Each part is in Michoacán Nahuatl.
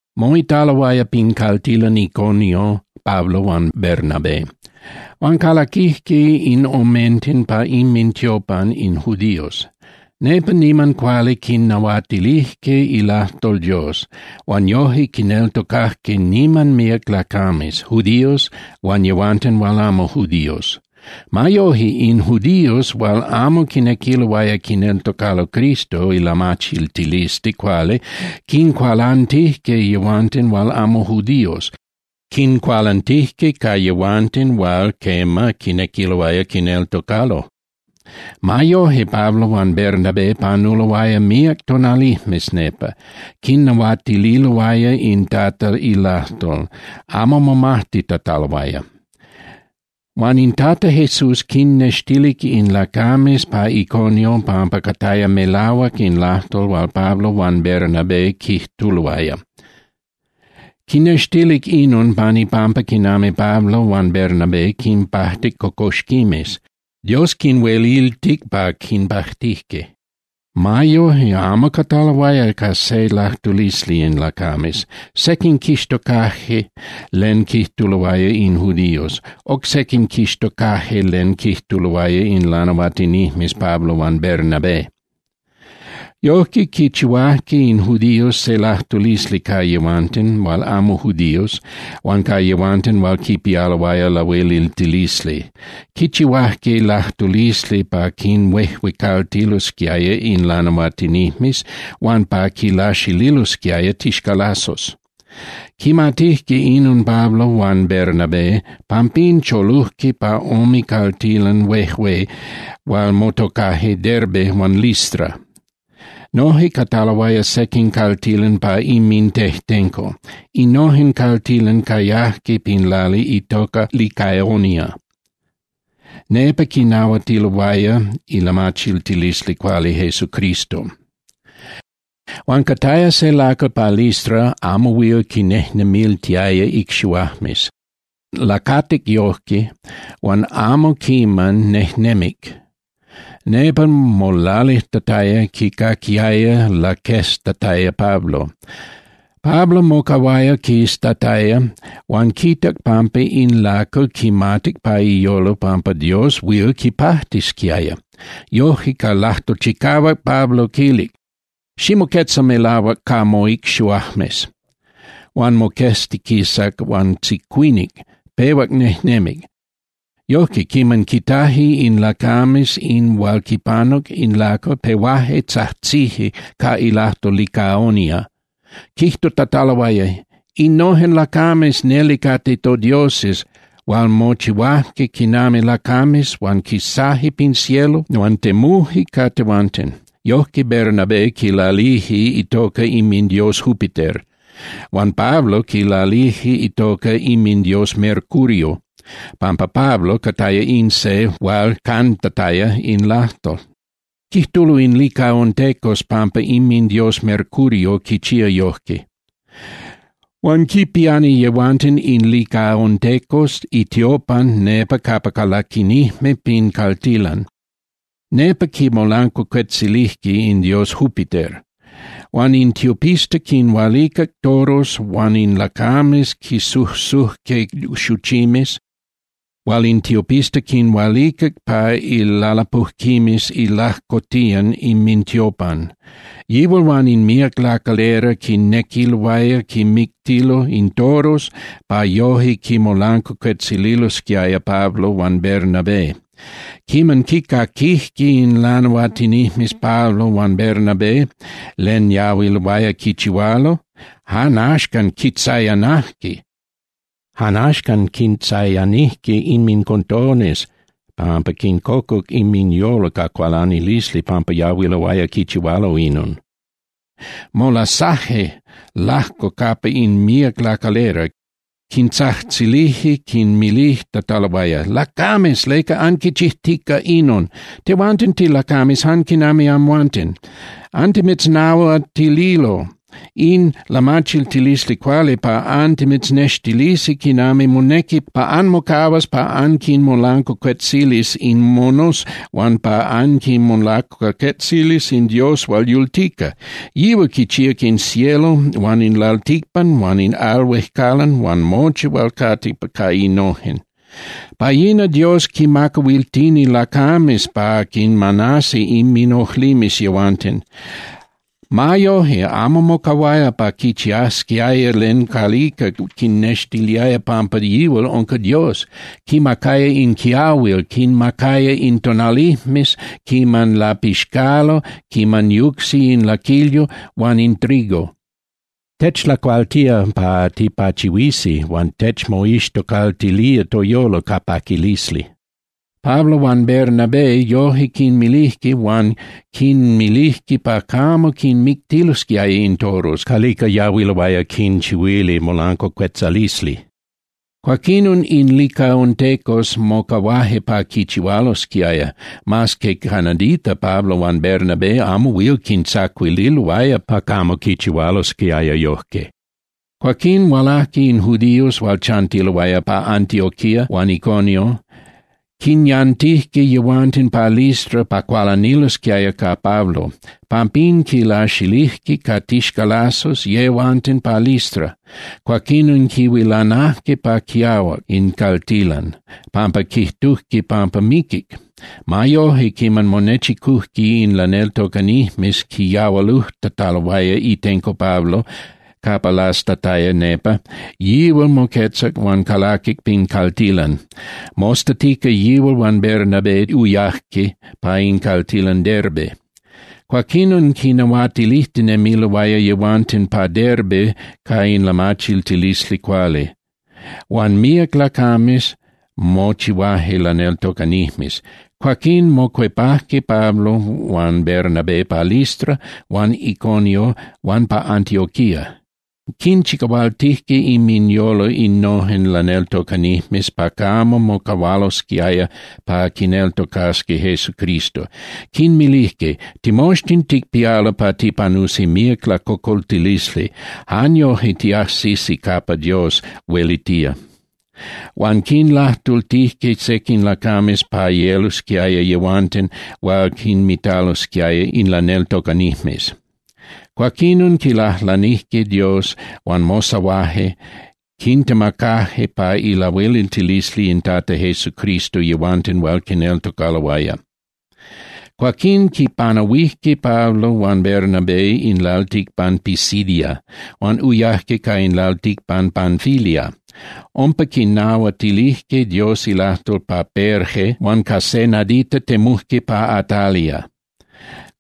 Moitaloaya pin caltilan Iconio Pablo huan Bernabé, huan calaquijque in omenten pa inmintiopan in judíos. Nepa niman cuali quinnahuatilijque ilajtol Dios, huan yoje quineltocajque niman míac lacames, judíos huan yehuanten hual amo judíos. Ma yoje in judíos hual amo quinequiloaya quineltocalo Cristo ilamachiltilisli cuali quincualantijque yehuanten hual amo judíos, quincualantijque ca yehuanten hual, quema, quinequiloaya quineltocalo. Ma yoje, Pablo huan Bernabé panuloaya míac tonalijmes nepa, quinnahuatililoaya in Tata ilajtol, amo momajtitataloaya. Huan in Tata Jesús quinnextilic in lacames pa Iconio pampa cataya melahuac in lajtol hual Pablo huan Bernabé quijtuloaya. Quinnextilic inon pan ipampa quinami Pablo huan Bernabé quinpajtic cocoxquimes, Dios quinhueliltic pa quinpajtije. Ma yoje, amo cataloaya ca se lajtulisli in lacames. Sequin quixtocaje len quijtuloaya in judíos, oc sequin quixtocaje len quijtuloaya in lanahuatinijmes Pablo huan Bernabé. Yojque, quichihuajque in judíos se lajtulisli ca yehuanten hual amo judíos huan ca yehuanten hual quipialoaya lahueliltilisli. Quichihuajque lajtulisli pa quinhuejuecaltilosquiaya in lanahuatinijmes huan pa quinlaxililosquiaya tixcalazos. Quimatijque inon Pablo huan Bernabé, pampín cholujque pa ome caltilan huejué hual motocaje Derbe huan Listra. Noje cataloaya sequin caltilan pa inmintejtenco. Innojen caltilan cayajque pin lali itoca Licaonia. Nepa quinahuatiloaya ilamachiltilisli cuali Jesucristo. Huan cataya se lacal pa Listra amo huil quinnejnemiltiaya icxihuajmes. Lacatic yojque huan amo quiman nejnemic. Nepa molalijtataya, quicaquiaya laqueztataya Pablo. Pablo mocahuaya quiztataya huan quitac pampa in lacal quimatic pa iyolo pampa Dios huil quipajtisquiaya. Yojque ca lajtol chicahuac, Pablo quilic: —Ximoquetza melahuac ca mocxihuajmes. Huan moqueztiquisac huan tzicuinic, pehuac nejnemic. Yojque, quiman quitaje in lacames in hual quipanuc in lacal, pehuaje tzajtzije ca ilajtol Licaonia, quijtutataloaya: —¡Innojen lacames neli cate todioses hual mochihuaje quinami lacames huan quisaje pin cielo huan temuje ca tehuanten! Yojque Bernabé quilalilije itoca inmindios Júpiter, huan Pablo quilalilije itoca inmindios Mercurio, pampa Pablo cataya in se hual cantataya in lajtol. Quijtulo in licaontecos pampa inmindios Mercurio quichía yojque. Huan quipiani yehuanten in licaontecos itiopan nepa capa calaquinijme pin caltilan, nepa quimolancuacuetzilinijme in dios Júpiter. Huan in tiopista quinhualicac toros huan in lacames quisujsujque xuchimes hual in tiopista quinhualicac pa ilalapujquimes ilajcotiyan inmintiopan. Yihual huan in míac lacalera quinequiloaya quinmictilo in toros pa yoje quinmolancuacuetzililosquiaya Pablo huan Bernabé. Quiman quicaquijque in lanahuatinijmes Pablo huan Bernabé len yahuiloaya quichihualo, jan axcan quintzayanijque inmincotones pampa quincocuc inminyolo ca cualanilisli pampa yahuiloaya quichihualo inon. Molasaje lajco capa in míac lacalera, quintzajtzilije quinmilijtataloaya: —¡Lacames! ¿Leca anquichijtica inon? Tehuanten tilacames jan quinami amhuanten. Antimitznahuatililo in lamachiltilisli cuali pa antimitznextilisi quinami monequi pa anmocahuas pa anquinmolancuacuetzilis in monos huan pa anquimolancuacuetzilis in Dios hual yultica. Yihual quichíac in cielo huan in lalticpan huan in al huejcalan huan mochi hual cate ca innojen. Pa yina Dios quinmacahuiltini lacames pa quinmanasi inminojlimes yehuanten. Ma yoje, amo mocahuaya pa quichiasquiaya len calica quinnextiliaya pampa yihual unca Dios. Quimacaya in quiahuil, quinmacaya in tonalijmes quiman lapixcalo quiman yucsi in laquilyo huan in trigo. Techlacualtía pa tipachihuisi huan techmoixtocaltilía toyolo ca paquilisli. Pablo huan Bernabé yojque quinmilijque huan quinmilijque pa camo quinmictilosquiaya in toros calica yahuiloaya quinchihuili molancuacuetzalisli. Cuaquinon in licaontecos mocahuaje pa quichihualosquiaya, mas que ca nadita Pablo huan Bernabé amo huil quintzacuililoaya pa camo quichihualosquiaya yojque. Cuaquín hualajque in judíos hual chantiloaya pa Antioquía huan Iconio, quinyantijque yehuanten pa Listra pa cualanilosquiaya ca Pablo. Pampín quilaxilijque ca tixcalazos yehuanten pa Listra, cuaquinon quihuilanajque pa quiahuac in caltilan pampa quijtujque pampa miquic. Ma yoje, quiman monechicujque in laneltocanijmes quiyahualujtataloaya itenco Pablo capa lastataya nepa, yihual moquetzac huan calaquic pin caltilan. Mostatica yihual huan Bernabé uyajque pa in caltilan Derbe. Cuaquinon quinnahuatilijtinemiloaya yehuanten pa Derbe ca in lamachiltilisli cuali, huan míac lacames mochihuaje laneltocanijmes. Cuaquín mocuepajque Pablo huan Bernabé pa Listra huan Iconio huan pa Antioquía. Quinchicahualtijque inminyolo innojen laneltocanijmes pa camo mocahualosquiaya pa quineltocasqui Jesucristo. Quinmilijque: —Timoxtin ticpialo pa tipanusi míac lacocoltilisli, jan yoje tiajsisi capa Dios huelitía. Huan quinlajtultijque sequin lacames pa yelosquiaya yehuanten hual quinmitalosquiaya in laneltocanijmes. Cuaquinon quilajlanijque Dios huan mosahuaje, quintemacaje pa ilahueliltilisli in Tata Jesucristo yehuanten hual quineltocaloaya. Cuaquín quipanahuijque Pablo huan Bernabé in lalticpan Pisidia, huan uyajque pa in lalticpan Panfilia. Umpa quinnahuatilijque Dios ilajtol pa Perge, huan ca se nadita temujque pa Atalia.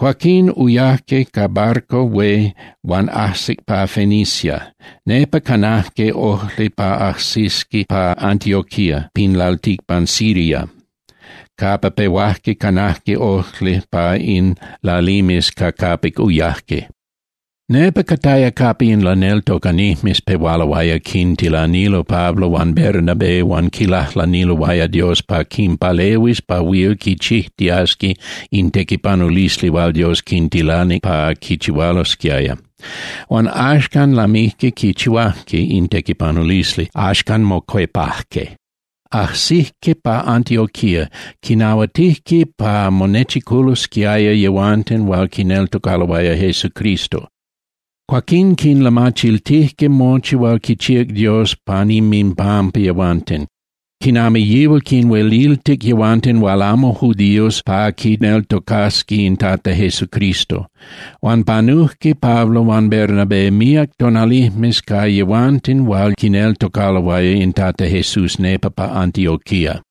Cuaquín uyajque ca barco hué huan ajsic pa Fenicia. Nepa canajque ojli pa ajsisqui pa Antioquía pin lalticpan Siria, capa pehuajque canajque ojli pa in lalimes ca capic uyajque. Nepa cataya capa in laneltocanijmes pehualoaya quintilanilo Pablo huan Bernabé huan quilajlaniloaya Dios pa quinpalehuis pa huil quichijtiasqui in tequipanulisli hual Dios quintilanic pa quichihualosquiaya. Huan axcan lamijque quichihuajque in tequipanulisli, axcan mocuepajque. Ajsijque pa Antioquía, quinahuatijque pa monechiculosquiaya yehuanten hual quineltocaloaya Jesucristo. Cuaquín quinlamachiltijque mochi hual quichíac Dios pan inminpampa yehuanten, quinami yihual quinhueliltic yehuanten hual amo judíos pa quineltocasqui in Tata Jesucristo. Huan panujque Pablo huan Bernabé míac tonalijmes ca yehuanten hual quineltocaloaya in Tata Jesús nepa pa Antioquía.